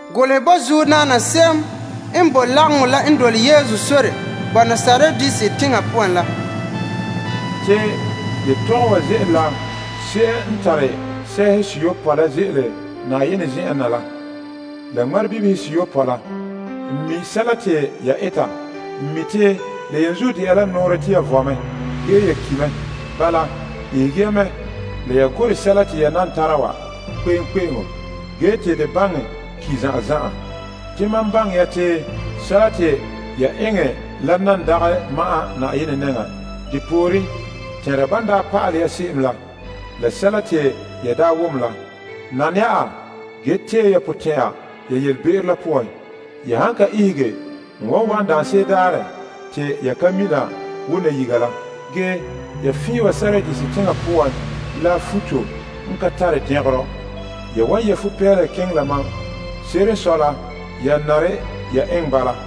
Golehɛ bo soŋora se'em n boe lagaŋɔ la n boe Sardis teŋa poan la. Yetɔgom wa ze'ele la se'em n tare sɛɛhe seyopɔe la n ze'ele Yenɛ zen'en na la, la ŋmarebibihe seyopɔe la. N mi' te nɛreba tɛn'ɛhɛ te ya vɔe ge ya ki' mɛ. Bala, ihege ya mɛ la ya gorɛ sɛla te ya nan tara wa kpe'eŋkpe'eŋo ge te de baŋɛ ki' zan'an zan'an. Te mam baŋɛ ya te sɛla te ya eŋɛ la dagɛ ma'an n Yenɛ nɛŋan. Bala tɛnra ban daa pa'alɛ ya se'em la la sɛla te ya daa wom la. Nana ya a, ge tee ya potɛn'ɛra ya yelebe'ero la poan. Ya han ka ihege, n wan wa'an daanse'ere daarɛ te ya ka mina wo nayiga la. Ya fiin wa Sardis teŋa poan la futo n ka tare dɛngerɔ. Ya wan yɛ' futo n ane fa'a kena la mam. Se'ere n sɔe la, ya nare bala.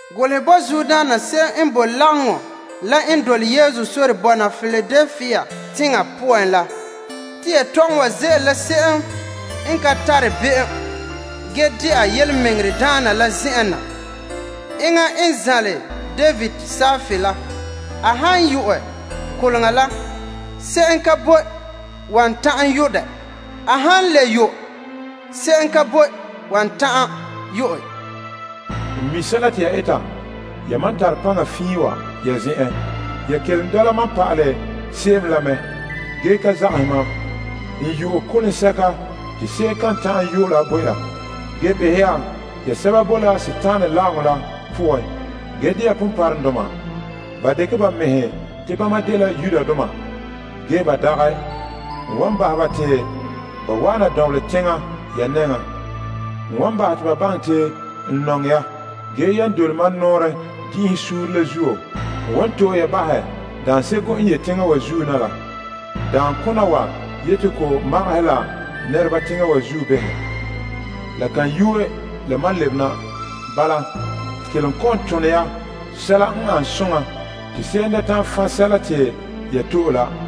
Golehɛ bo soŋora se'em n boe lagaŋɔ la n boe Piladelpia teŋa poan la. Yetɔgɔbɔna wa ze'ele la se'em n de Fa'a la yelemɛŋɛrɛdaana la zen'en na. Enŋa n zanle David kparehega la. A han yu'ɛ koleŋa la, se'em ka boe wan ta'an yo' dɛ. A han le yo', se'em ka boe wan ta'an yu'ɛ. N mi' sɛla te ya eta. N mi te ya paŋa ka zo'e, ge ya kelom dɛna la birikindoma bo mam pa'alɛ se'em la. N yu'ɛ koleŋa biŋe ya te se'em kan ta'an yo' ka. Ge behɛ ya, ya sɛba boe la Dima la lagaŋɔ la poan ge dɛna ponpɔrɔŋdoma. Ba dekɛ ba mɛhe te bama dela Yudoma. Ge ba dagɛ. N wan bahɛ ba te ba wa'ana dɔnbelɛ teŋa ya nɛŋan. N wan bahɛ te ba baŋɛ te n nɔŋɛ ya. Ge yan dole mam nɔɔrɛ din'inhe suunre la zuo, n wan to'e ya bahɛ daanseko n ye teŋa wa zuo woo na la, te ko magahɛ la nɛreba teŋa wa zuo behɛ. La kan yuue la mam lebe na. Bala, kelom kɔ'ɔn tone ya sɛla n ane soŋa te se'em da ta'an fan' sɛla te ya to'e la.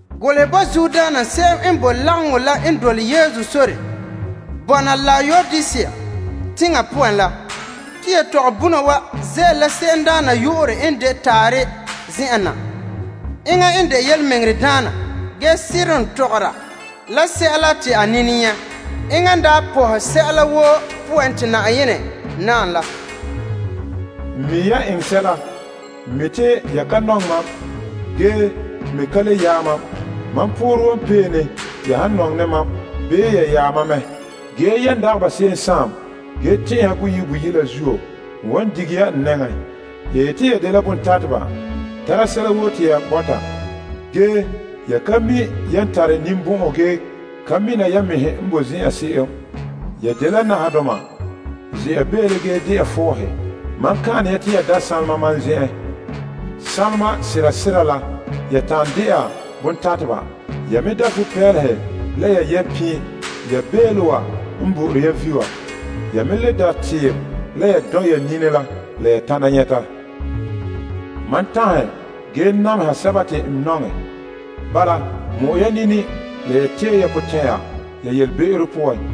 Golehɛ bo soŋora se'em n boe lagaŋɔ la n boe Laodisea teŋa poan la. Yetɔgɔbɔna wa ze'ele la se'emdaana yu'urɛ n de Taarɛ la zen'en na. Enŋa n de yelemɛŋɛrɛdaana ge seren tɔgɔra la sɛla te a nini nyɛ'. Enŋa daa pɔhɛ sɛla woo poan te Yenɛ naam la. N mi' ya eŋɛ sɛla. N mi' te ya ka nɔŋɛ mam ge me ka le yaɛ mam. Mam poorɛ wan pee ne ya han nɔŋɛ ne mam bii ya yaɛ mam mɛ. Ge yan dagɛ ba se'em la ge tɛn'ɛha boyi' boyi' la zuo, n wan dige ya n nɛŋan. Ya yeti te ya dela bontateba tara sɛla woo te ya bɔta. Ge ya ka mi' yan tare ninbɔn'ɔn ge ka mina ya mɛhe n boe zen'an se'em. Ya dela nahadoma, ze'a beele ge de'a fɔɔhe. Mam ka'an ne ya te ya da' sanlema mam zen'en. Sanlema sera sera la ya ta'an de'a bontateba. Ya me da' futo n ane fa'a la ya yɛ' pin' ya beele wa n bo'ore ya vi' wa. Ya me le da' tiim la ya sɔn' ya nini la la ya ta'ana nyɛta. Mam tanhe ge nameha sɛba te n nɔŋɛ. Bala mɔ'ɛ ya nini la tee ya potɛn'ɛra ya yelebe'ero poan.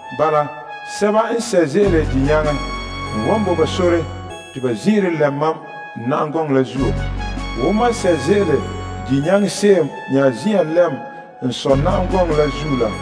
Bala, sɛba n nyaŋɛ, n wan bo ba sore te ba zin'ire lɛm mam n na'am gɔŋɔ la zuo. Wo mam n nyaŋɛ se'em nya zin'an lɛm n Sɔ' na'am gɔŋɔ la zuo la.